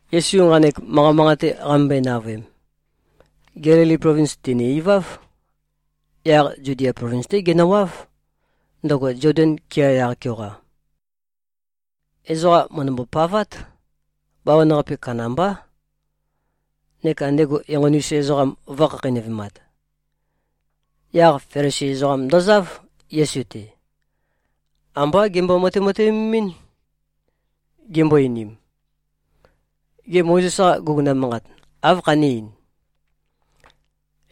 Yesu nqanek manqa manqate qamømbøe-navøem, Gelili plovins tène-iváv. Yaq Zudia plovins-té genøwáv, ndøgo Zoden kea yaq-keoqa. Ezoqa mø̀ndømbo-pavát, bawan-qape kandambá, neka ndego enqoni-us ezoqam vø̄khakheinøvemat. Yaq Felisi ezoqam ndozáv, Yesu-te. Ambá gembo-matemateømemín, gimbo-einim, “Gê, Mozes-qa guguna manqat, áv khané-ein?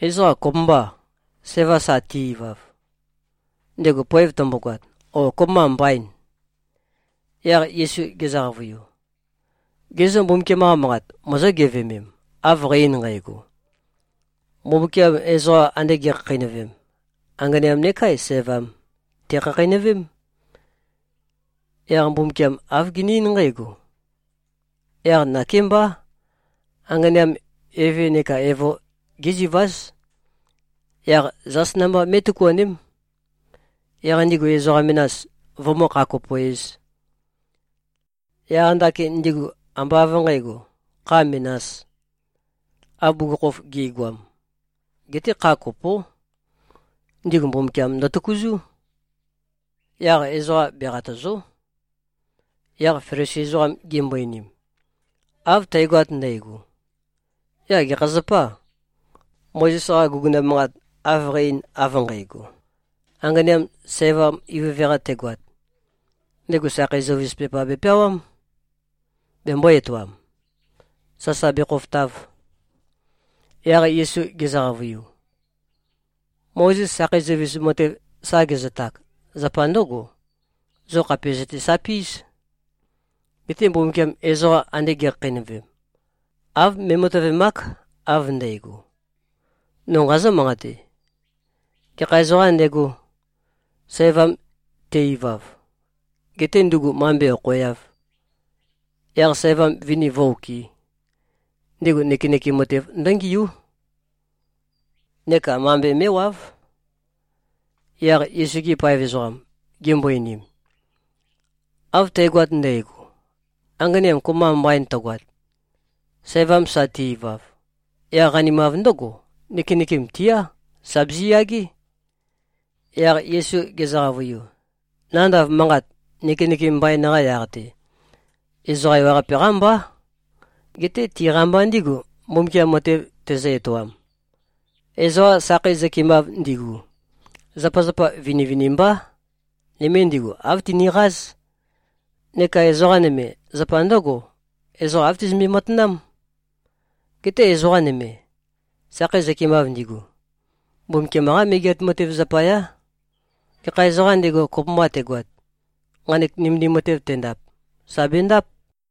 Ezoqa kopømbâ, sævam sa te-ivav, ndego poev tømbogoat, ó, kopømba mbaîn?” Yaq Yesu gezø-qavøiu, “Ge zô, Mbumbukiam-qa Manqat mozó-geveømem, av qæ-ein nqægo? ‘Mbumbukiam ezoqa ande ge꞉khakheinøvem, anganeam neká sævam, tèkhakheinøvém.’ Yaq Mbumbukiam āv gene-eín nqǽgo, ‘Yaq nakémbá, anganeam eve neka evo géziváz. Yaq zās namba mé꞉tøkuaném, yaq ndigu ezoqa menas, vømǿ-kha-kopo-ēz.’ Yaq ndakin ndigu ambá av nqǣgo, kha menās, av bugukhokhof gi꞉goam. Geté kha kopó. Ndigu Mbumbukiam ndøtøkuzú. Yaq ezoqa beqatø̀zo᷄.” Yaq Felisi ezoqam gimbo-einim, “Av tægoat ndægo, yaq gekha zapâ, Mozes-qa guguna manqat av qæ-ein av nqægo? Anganeam sævam ivøve-qa tegoat, ndego sakhei zøuvis pepa bepeawám, bembō-etoam, sasa bekhofotav.” Yaq Yesu gezø-qavøiu, “Mozes sakhei zøuvis matev sa gezøtak, zapa ndǿgo: Zo khàpe zøtesapí꞉z. Geté Mbumbukiam ezoqa ande ge꞉khakheinøvem, av me꞉matøvemák, av ndægo. No nqazǿ-manqate: Gekha ezoqām ndego, sævam te-ivav, getē ndugu mambe okhoeāv, yaq sævam vini vǿ-okɨ̄, ndego nøkenøkem matev ndǿngiú neka mambe mé꞉wáv.” Yaq Yesu-gi paev ezoqam gimbo-einim, “Av tægoat ndægo, anganeam kopømba mbain tøgoat, sævam sa te-ivav, yaq qanimav ndǿgo, nøkenøkem tiá, sà biziyagé.” Yaq Yesu gezø-qavøiu, “Nandav manqat, nøkenøkem mbain-qa yaq-te, ezoqa ewaqape-qá mbá. Geté tiqa mba ndígu, Mbumbukiam matev tezø-etoam. Ezoqa sakhei zøkemav ndigu, zapazapa vinivinimbá. Nøme ndigu āv tiniqáz. Neka ezoqa nøme, zapa ndǿgo: Ezoqa āv tizømbe-matanám. Geté ezoqa nøme, sakhei zøkemav ndigu, Mbumbukiam-qá Megeat Matev zapayá. Gekha ezoqām ndego, kopømba tegoat, nqanek nømendim matev tendap, sà bendáp.”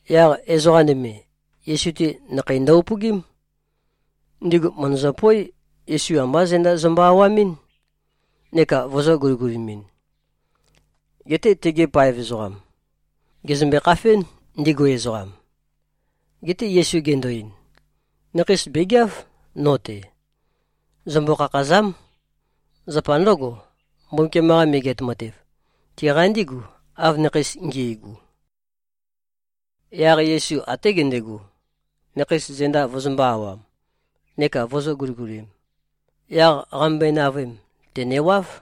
Yaq ezoqa nøme, Yesu-te, nakheis ndo-upøgím. Ndigu mø̀ndøzøpoé, Yesu ambá zenda zømbø-awamɨ́n neka vøzø̄-guligulimɨn. Geté tegi paev ezoqam gèzømbe-khafén, ndigu ezoqam. Geté Yesu gendo-ein, “Nakheis bègeáv, no-te. Zømbo-khakhàza᷄m. Zapa ndǿgo, Mbumbukiam-qa Megeat Matev, tiqa ndígu, av nakheis ngi꞉gu.” Yaq Yesu até gendego, nakheis zenda vøzømbø̄-awam neka vøzø̄-guligulim. Yaq qamømbøe-navøem, tènewáv.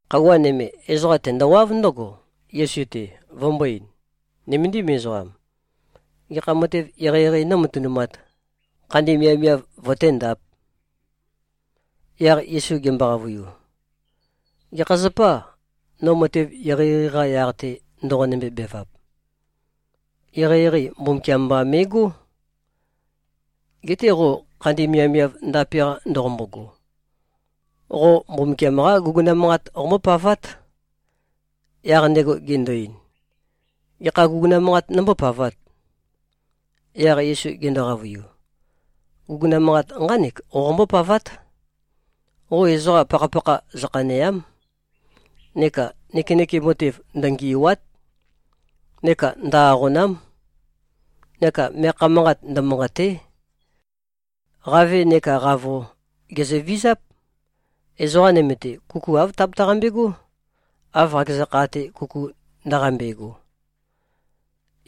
Khøuwa nøme, ezoqa tendowáv ndǿgo, Yesu-te, vømbō-ein, “Nøméndim ezoqam. Gekha matev eqeieqei nómatønumāt, khandi miavmiav vøténdāp?” Yaq Yesu gembo-qavøiu, “Gekha zapâ, no matev eqeieqei-qa yaq-te, ndoqonømbe-bevap? Eqeieqei Mbumbukiam mba me꞉gó. Geté qo khandi miavmiav ndape-qa ndoqombogo, qo Mbumbukiam-qá guguna manqat qombópavát.” Yaq ndego gendo-ein, “Gekha guguna manqat nombópavāt?” Yaq Yesu gendo-qavøiu, “Guguna manqat nqánek qoqombó-pavát: Qo ezoqa pakhapakha zøkhanèa᷄m. Neka nøkenøkem matev ndøngì꞉wa᷄t. Neka ndø-aqòna᷄m. Neka meakha manqat ndømanqàte᷄. Qave neká qavo, gèzøvizáp. Ezoqa nøme-te, kuku āv tabetaqambe꞉gó, av qakeza kha-te kuku ndaqambe꞉go.”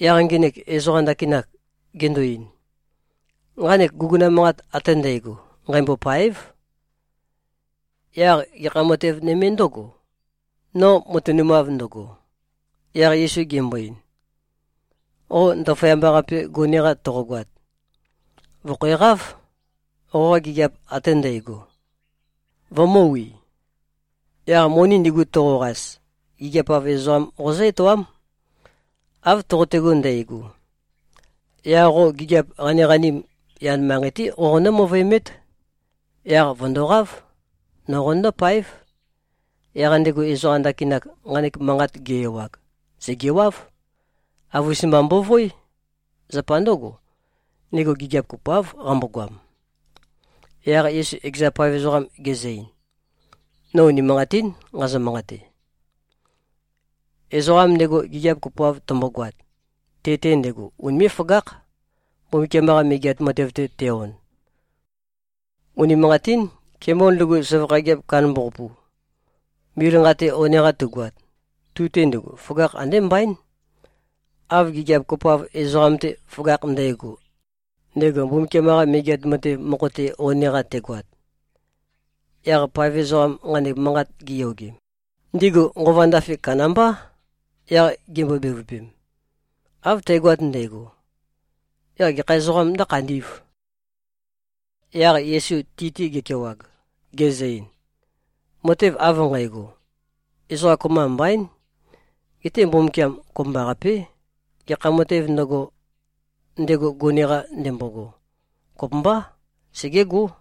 Yaq ngenek ezoqa ndakinak gendo-ein, “Nqanek guguna manqat ate ndægo nqæmbôpáev. Yaq gekha matev nøme ndǿgò, no matønumav ndøgo?” Yaq Yesu gembo-ein, “Qo ndaføyamba-qape gone-qa toqogoat, vø̀khæqáv, qoqa gigiap ate ndægo, vømø̄wi. Yaq moni ndigu toqoqas, gigiap-av ezoqam qozǿ-etoám. Av toqotego ndægo, yaq qo gigiap qaniqanim yan manqei-té qoqonǿ-møvøemét. Yaq vø̀ndoqáv. No qonøndó-páev.” Yaq ndego ezoqa ndakinak, nqanek manqat ge-ewag, sègewáv. Avus-mba mbovoé. Zapa ndǿgo, ndego gigiap kopoáv qambogoam. Yaq Yesu ekeza paev ezoqam gezø-ein, “No unimanqatín nqazø-manqate. Ezoqam ndego gigiap kopoav tømbogoat, te-te ndego unimé꞉-føgákh, Mbumbukiam-qa Megeat Matev-te te-on. Unimanqatín. Kemol ndugu, søvakha gigiap kandambaqapu, mil nqa-te one-qa tugoat, tu-te ndugu, føgakh andé mbaín, av gigiap kopoav ezoqam-te føgakh ndægo, ndego Mbumbukiam-qa Megeat Matev mokho-te one-qa tegoat.” Yaq paev ezoqam nqanek manqat giyogem, ndigu nqova ndafe kandambá, yaq gimbo-bevøpem, “Av tægoat ndægo, yaq gekha ezoqām ndǿkhandī꞉v?” Yaq Yesu ti-te gekewag, gezø-ein, “Matev av nqægo, ezoqa kopømba mbaín. Geté Mbumbukiam kopømbaqapé. Gekha matēv ndøgo, ndego gone-qa ndembogo, kopømbá, segégó.”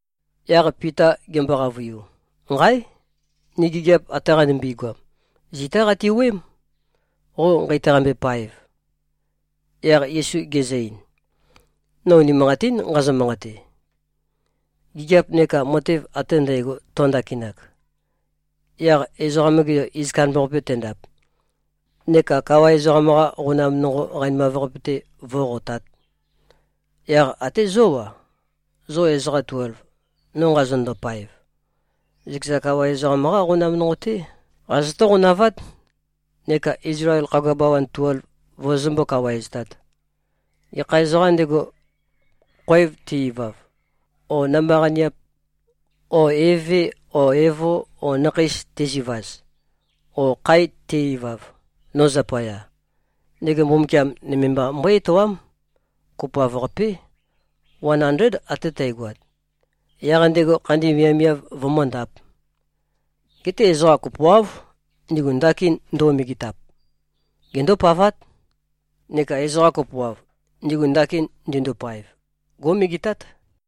Yaq Pita gembo-qavøiu, “Nqáe! Ni gigiap ate qanimbi-goam, zitá qati-wuøém, qo nqeitaqambe-paev.” Yaq Yesu gezø-ein, “No unimanqatín nqazø-manqate. Gigiap neka matev ate ndægo tøndakinak, yaq Ezoqam-ge Yo iz kandambaqape tendap, neka kawa ezoqam-qa qonam nonqo qanimav-qape-te vó꞉qotāt, yaq até zó-a, zo ezoqa tuelv, no nqazonøndo-paev, zøkeza kawa ezoqam-qá qonam nonqo-té qazotó-qonavát, neka Izlael khagua bawan tuelv vozozømbó-kawaeztāt. Gekha ezoqām ndego, khoev te-ivav, o namba-qaniap o eve o evo o nakheis tezivaz, o khae te-ivav, no zapaya; ndego Mbumbukiam nøme mba mbøé-etoám, kopoav-qapé, wan andléd ate tægoat, yaq ndego khandi miavmiav vømǿndāp. Geté ezoqa kopoáv, ndigu ndakin nduo-megetap, gendópavát. Neka ezoqa kopoav, ndigu ndakin ndindopaev, gó꞉megetát.”